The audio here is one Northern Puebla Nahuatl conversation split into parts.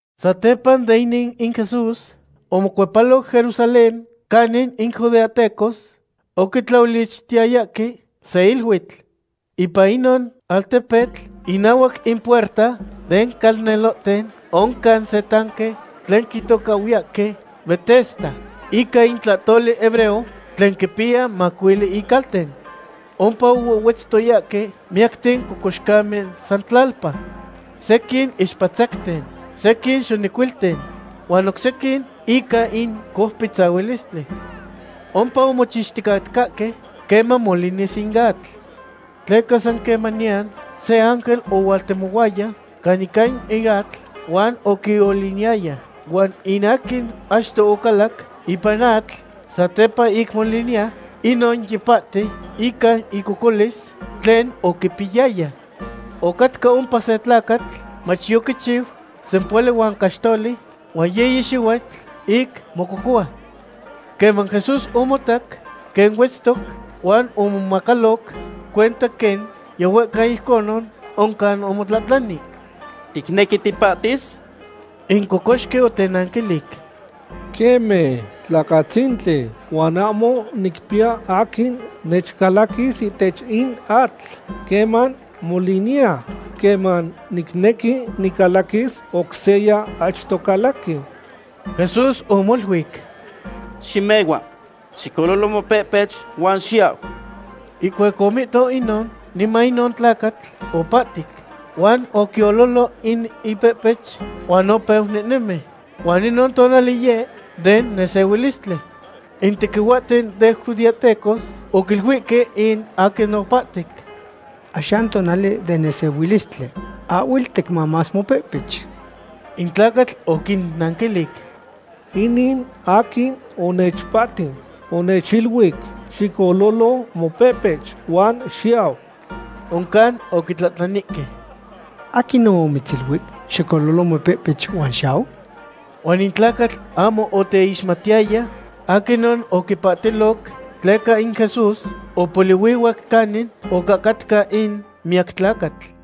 Satepa den inin in Jesús omocuepaloc Jerusalén canin in judeahtecos oquitlaolichtiyayahque se iluitl. Ipan inon altepetl, inahuac in puerta den calnelohten, oncan se tanque tlen quitocahhuiyahque Betesda ica in tlahtoli hebreo, tlen quipiya macuili icalten. Ompa ohuehhuetztoyahque miyacten cocoxcamen san tlalpa: sequin ixpatzacten, sequin xonecuilten, huan oc sequin ica in coupitzahuistli. Ompa omochixticatcahque queman molinis in atl. Tleca san quequemanian se ángel ohualtemohuaya caninca in atl huan oquioliniyaya, huan in aquin achto ocalac ipan in atl satepa ic moliniya, inon yipahti ican icocolis tlen oquipiyaya. Ocatca ompa se tlacatl mach yoquichiu sempohuali huan caxtoli huan yiyi xihuitl ic mococohua. Queman Jesús omotac quen huetztoc, huan omomacaloc cuenta quen yihuehcau ijconon, oncan omotlahtlani: ―¿Ticnequi tipahtis? In cocoxqui otenanquilic: ―Queme, tlacatzintli, huan ahmo nicpiya aquin nechcalaquis ihtech in atl queman moliniya. Queman nicnequi nicalaquis, oc seya achto calaqui. Jesús omoluic: ―Ximehua. Xicololo mopehpech, huan xiyau. Ihcuac omihto inon, niman inon tlacatl opahtic, huan oquiololo in ipehpech huan opeu nehnemi. Huan inon tonali yeh den nesehuilistli. In tequihuahten den judeahtecos oquiluihque in aquin opahtic: ―Axan tonali den nesehuilistli. Ahhuel ticmamas mopehpech. In tlacatl oquinnanquilic: ―In aquin onechpahti, onechiluic: “Xicololo mopehpech huan xiyau.” Oncan oquitlahtlanihque: ―¿Aquinon omitziluic: “Xicololo mopehpech huan xiyau”? Huan in tlacatl ahmo oteixmatiyaya aquinon oquipahtiloc, tleca in Jesús opolihuihuac canin ocahcatca in miyacatlacatl.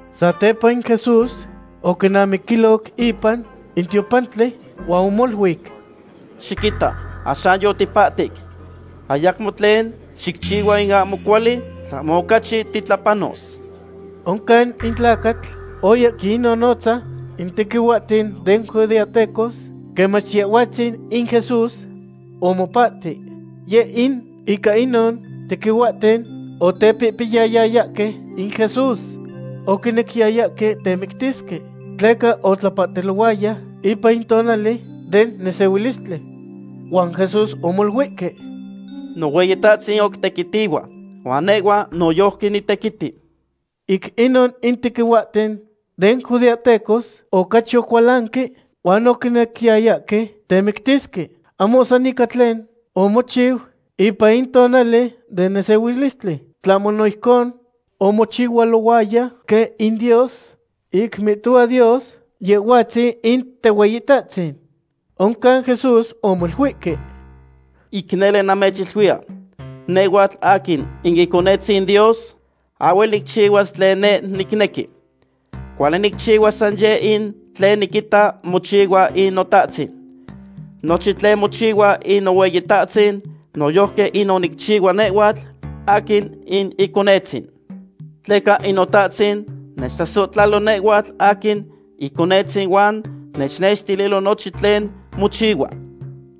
Satepa in Jesús oquinamiquiloc ipan in tiopantli, huan omoluic: ―Xiquita, axan yotipahtic. Ayacmo tlen xicchihua in ahmo cuali, tlahmo ocachi titlapanos. Oncan in tlacatl oya quinnonotza in tequihuahten den judeahtecos quen mach Yehhuatzin in Jesús omopahti. Yeh in ica inon tequihuahten otepihpiyayayahque in Jesús. Oquinequiyayahque temictisque, tleca otlapahtilohuaya ipan in tonali den nesehuilistli. Huan Jesús omoluihque: ―Nohueyitahtzin oc tequitihua, huan nehhua noyojqui nitequiti. Ic inon in tequihuahten den judeahtecos ocachi ocualanque huan oquinequiyayahque temictisque, ahmo san ica tlen omochiu ipan in tonali den nesehuilistli, tlahmo no ijcon omochihualohuaya quen in Dios, ic mihtohua Dios Yehhuatzin in Tehueyitahtzin. Oncan Jesús omoluihque: ―Ic nele namechiluiya, nehhuatl aquin in Iconetzin Dios ahhuel nicchihuas tlen neh nicnequi. Cuali nicchihua san yeh in tlen niquita mochihua in Notahtzin. Nochin tlen mochihua in Nohueyitahtzin, noyojqui inon nicchihua nehhuatl aquin in Iconetzin. Tleca in Notahtzin nechtlasohtlalo nehhuatl aquin Iconetzin huan nechnextililo nochin tlen mochihua.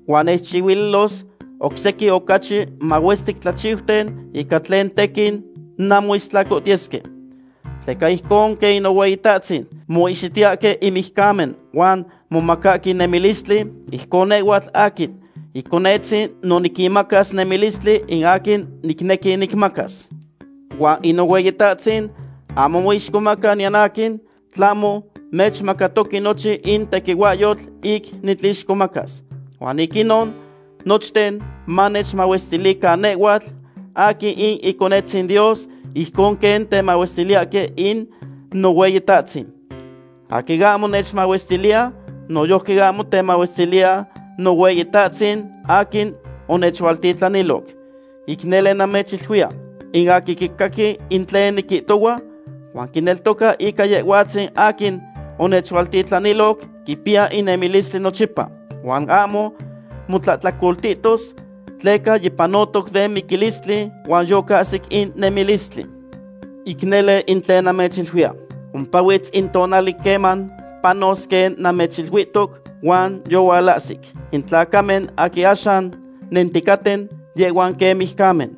Huan nechchihuililos oc sequin ocachi mahuestic tlachiuten ica tlen tequin nanmoistlacohtiyesque. Tleca ijcon quen in Nohueyitahtzin moihxitiyahque in mijcamen huan momacahque nemilistli, ijcon nehhuatl aquin Iconetzin no niquinmacas nemilistli in aquin nicnequi nicmacas. Huan in Nohueyitahtzin ahmo moixcomaca niyan aquin, tlahmo nechmacatoque nochin in tequihuahyotl ic nitlixcomacas. Huan ic inon, nochten manechmahuestilican nehhuatl aquin in Iconetzin Dios ijcon quen temahuestiliyahque in Nohueyitahtzin. Aquin ahmo nechmahuestiliya, noyojqui ahmo temahuestiliya Nohueyitahtzin aquin onechualtitlaniloc. ’Ic nele namechiluiya, in aquin quicaqui in tlen niquihtohua, huan quineltoca ica Yehhuatzin aquin onechualtitlaniloc, quipiya in nemilistli nochipa. Huan ahmo motlahtlacoltitos, tleca yipanotoc den miquilistli huan yocahsic in nemilistli. Ic nele in tlen namechiluiya. Ompahuitz in tonali queman panos quen namechiluihtiu, huan yohualahsic. In tlacamen aquin axan nenticaten, yehhuan quen mijcamen.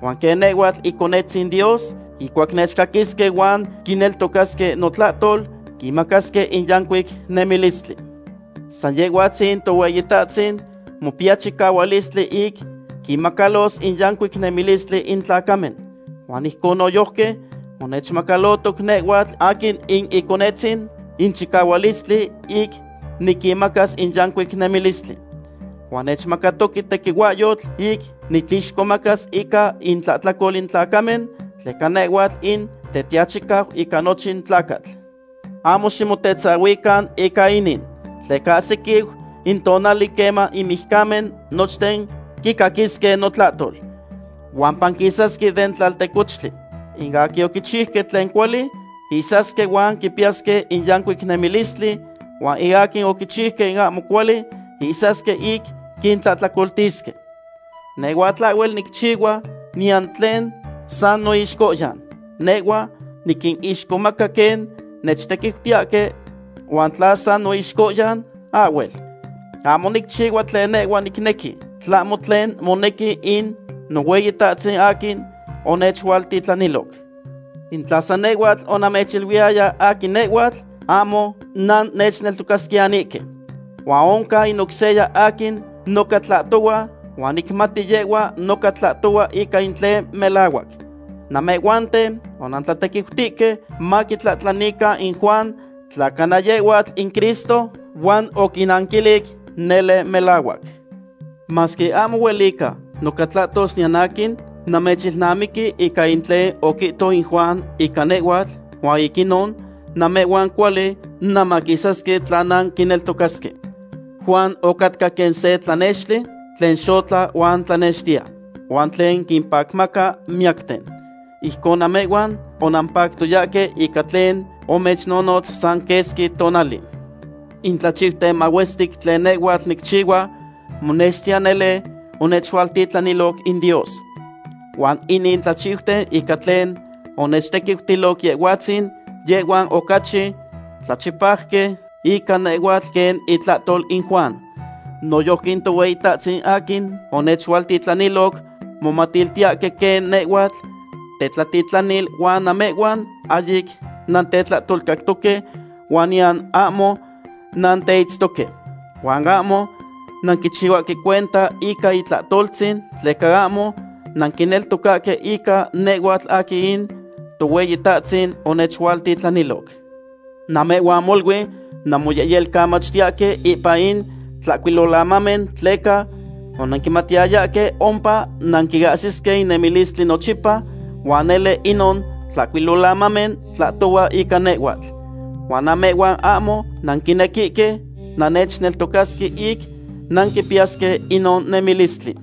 Huan quen nehhuatl Iconetzin Dios, ihcuac nechcaquisque huan quineltocasque notlahtol, quinmacasque in yancuic nemilistli. San Yehhuatzin in Tohueyitahtzin mopiya chicahuilistli ic quinmacalos in yancuic nemilistli in tlacamen. Huan ijcon noyojqui onechmacalotoc nehhuatl aquin in Iconetzin in chicahuilistli ic niquinmacas in yancuic nemilistli. Huan nechmacatoque tequihuahyotl ic nitlixcomacas ica intlahtlacol in tlacamen, tleca nehhuatl in Tetiachicau ica nochin tlacatl. Ahmo ximotetzahuican ica inin, tleca ahsiquiu in tonali queman in mijcamen nochten quicaquisque notlahtol. Huan panquisasque den tlaltecohtli. In aquin oquichiuque tlen cuali, ihsasque huan quipiyasque in yancuic nemilistli, huan in aquin oquichiuque in ahmo cuali ihsasque ic quintlahtlacoltisque. ’Nehhuatl ahhuel nicchihua niyan tlen san noixcohyan. Nehhua niquinixcomaca quen nechtequiutiyahque huan tla san noixcohyan, ahhuel. Ahmo nicchihua tlen nehhua nicnequi, tlahmo tlen monequi in Nohueyitahtzin aquin onechualtitlaniloc. In tla san nehhuatl onamechiluiyaya aquin nehhuatl, ahmo nannechneltocasquiyanihque. Huan oncan in oc seya aquin noca tlahtohua huan nicmati yehhua noca tlahtohua ica in tlen melahuac. Namehhuanten onantlatequiutihque maquitlahtlanican in Juan tla cana yehhuatl in Cristo, huan oquinnanquilic nele melahuac. Masque ahmo huelica noca tlahtos niyan aquin, namechilnamiqui ica in tlen oquihto in Juan ica nehhuatl huan ic inon namehhuan cuali nanmaquisasque tla nanquineltocasque. Juan ocatca quen se tlanextli tlen xotla huan tlanextiya, huan tlen quimpacmaca miyacten. Ijcon namehhuan onampactoyahque ica tlen omechnonotz san quesqui tonali. In tlachiuten mahuestic tlen nehhuatl nicchihua monextiya nele onechualtitlaniloc in Dios. Huan inin tlachiuten ica tlen onechtequiutilo Yehhuatzin, yehhuan ocachi tlachipajque ica nehhuatl quen itlahtol in Juan. Noyojqui in Tohueyitahtzin aquin onechualtitlaniloc momatiltiyahque quen nehhuatl tetlatitlanil huan namehhuan ahyic nantetlahtolcactoque huan niyan ahmo nanteitztoque. Huan ahmo nanquichihuahque cuenta ica itlahtoltzin tleca ahmo nanquineltocahque ica nehhuatl aquin in Tohueyitahtzin onechualtitlaniloc. Namehhuan molui nanmoyehyelcamachtiyahque ipan in Tlahcuilolamamen tleca onanquimatiyayahque ompa nanquiahsisque in nemilistli nochipa, huan nele inon Tlahcuilolamamen tlahtohua ica nehhuatl. Huan namehhuan ahmo nanquinequihque nannechneltocasque ic nanquipiyasque inon nemilistli.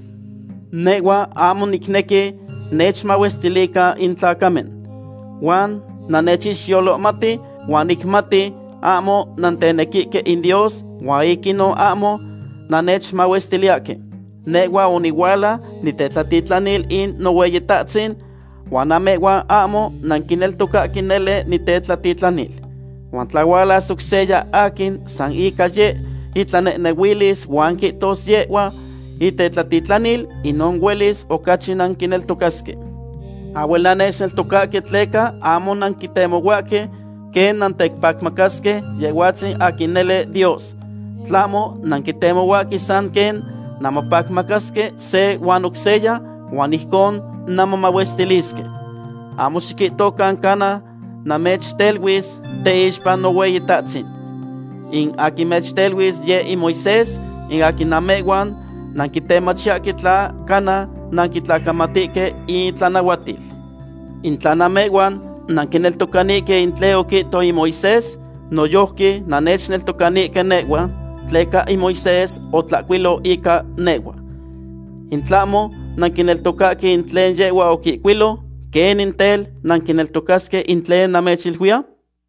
’Nehhua ahmo nicnequi nechmahuestilican in tlacamen. Huan namechixyolohmati huan nicmati ahmo nantenequihque in Dios huan ic inon ahmo nannechmahuestiliyahque. Nehhua onihuala nitetlatitlanil in Nohueyitahtzin, huan namehhuan ahmo nanquineltocahque nele nitetlatitlanil. Huan tla hualas oc seya aquin san ica yeh itlanehnehuilis huan quihtos yehhua itetlatitlanil, inon huelis ocachi nanquineltocasque. Ahhuel nannechneltocahque tleca ahmo nanquitemohuahque quen nantepacmacasque Yehhuatzin aquin nele Dios. Tlahmo nanquitemohuahque san quen nanmopacmacasque se huan oc seya huan ijcon nanmomahuestilisque. Ahmo xiquihtocan cana namechteluis teixpa Nohueyitahtzin. In aquin mechteluis yeh in Moisés, in aquin namehhuan nanquitemachiyahque tla cana nanquitlacamatihque itlanahuatil. In tla namehhuan nanquineltocanihque in tlen oquihto in Moisés, noyojqui nannechneltocanihque nehhua, tleca in Moisés otlahcuilo ica nehhua. In tlahmo nanquineltocahque in tlen yehhua oquihcuilo, ¿quenin tel nanquineltocasque in tlen namechiluiya?